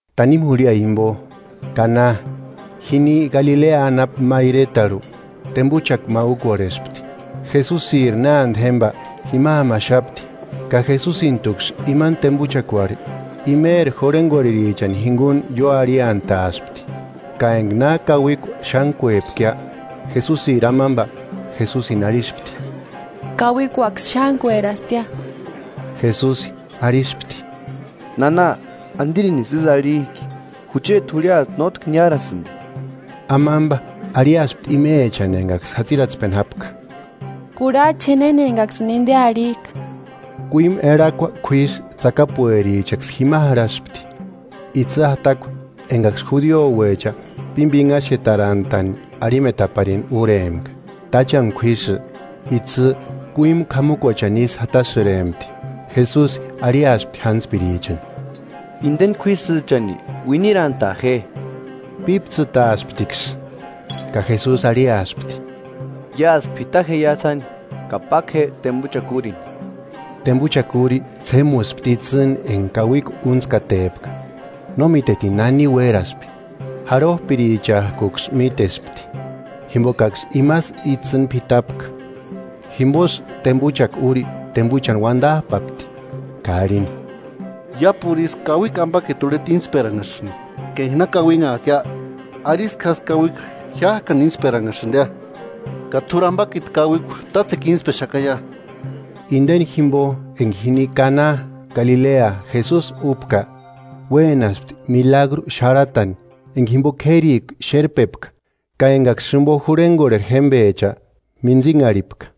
Tanimu jurhia jimpo, Kana, jini Galilea anapu ma iretarhu, tempuchaku ma úkorhespti. Jesusiri nánte jémpa jima jámaxapti, ka Jesusintuksï imani tempuchakuarhu imeri jurhenkorherichani jinkuni ióarhiantaaspti. Ka enka na kauikua xántkuepkia, Jesusiri amampa Jesusini arhispti: –Kauikuaksï xántkuerastia. Jesusi arhispti: –Nana, ¿Antirinisï ísï arhik'i? Jucheti jurhiata nótki niárasïnti. Amampa arhiaspti imechani enkaksï jatsiratspeni jápka: –Kurhach'a je néna enkaksïni inte arhik'a. Kuímu erhakua k'uísï tsakapuerichaksï jima jarhaspti, itsï jatakua, enkaksï judiouecha pímpinhaxetarantani arhimetaparini úrempka. Táchani k'uísï, itsï kuímu k'amukuachani isï jatasïrempti. Jesusi arhiaspti jántspirichani: –Inteni k'uísïchani uinirantaa je. Píptsïtaasptiksï, ka Jesusi arhiaspti: –Iásï p'ita jeia sáni, ka páku je tempuchakua úrini Tempuchakua úri ts'émuspti itsïni enka kauikua úntskatepka, no mítetini nani uéraspi, járhop'irichak'uksï mítespti, jimpokaksï imasï itsïni p'itapka. Jimposï tempuchakua úri tempuchani uantap'apti ka arhini: –Iápuru isï kauikua ampakiti urheta íntsperanhasïnti ka enka na kauinhak'ia, arisku jásï kauikua jiák'ani ínstperanhasïntia. Ka t'úri ampakiti kauikua tátsekua intspexakaia. Inteni jimpo, enka jini Kana Galilea Jesusi úpka, uénaspti milagru xarhatani enka jimpo k'érikua xérpepka ka enkaksï jimpo jurhenkorheri jémpecha mintsinharhipka.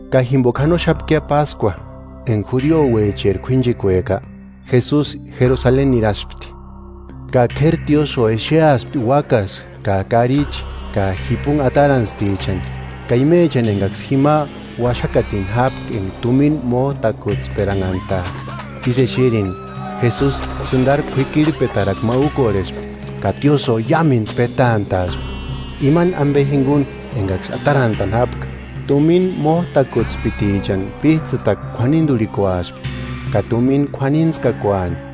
Ka jimpoka janoxapkia páskua, enka judiouecheri k'uínchekueka, Jesusi Jerusaleni niraspti. Ka k'éri tiósïo exeaspti úakasï ka karichi ka jipunhi atarantstichani, ka imechani enkaksï jima uaxakatini jápka enka tumina mót'akutsperanhantak'a. Ísï exerini, Jesusi sïntariri k'uikirhpetarakua ma úkorhespti, ka tiósïo iámentu petant'a'aspti, imani ampe jinkuni enkaksï atarantani jápka. Tumina mót'akutspitichani píts'ïtakua k'uaninturhikuaspti ka tumina k'uanintskakuani.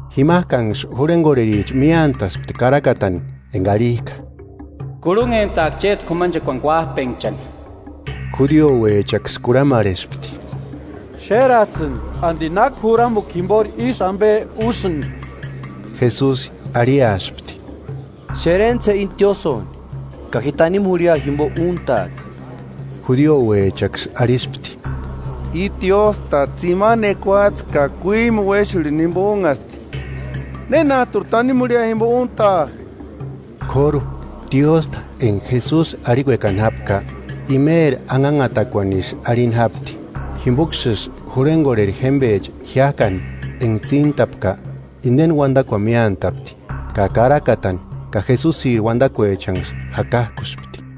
Jimak'anksï jurhenkorhericha miántaspti karakatani enka arhik'a: “Kurhunhentaaka chéti k'umanchekuani kuap'enhchani.” Judiouechaksï kurhamarhespti: –Xérats'ïni, ¿Anti náki juramukua jimpori ísï ampe úsïnki? Jesusi arhiaspti: –Xerentsï je íni tiósïoni, ka ji tanimu jurhia jimpo úntaaka. Judiouechaksï arhispti: –I tiósta Tsimani ekuatse ka kuímu uéxurhini jimpo únhasti ¿Nénat'uri tanimu jurhia jimpo úntaa? K'óru, tiósta enka Jesusi arhikuekani jápka; imeri anhanhatakuanisï arhini jápti. Jimpoksïsï jurhenkorheri jémpecha jiák'ani enka tsíntapka, inteni uantakuani miántapti, ka Karakatani ka Jesusiri uantakuechanksï jakak'uspti.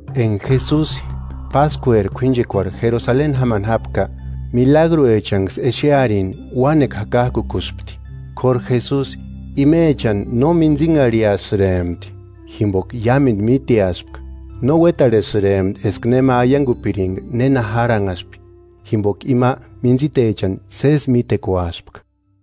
Enka Jesusi, páskueri k'uínchekuarhu Jerusaleni jámani jápka, milagruechanksï exearini uánekua jakak'ukuspti. K'óru Jesusi, imechani no mintsinharhiasïrempti jimpoka iámentu míteaspka No uétarhesïrempti eska nema aiankupirinka néna járhanhaspi, jimpoka ima mintsitechani sési mítekuaspka.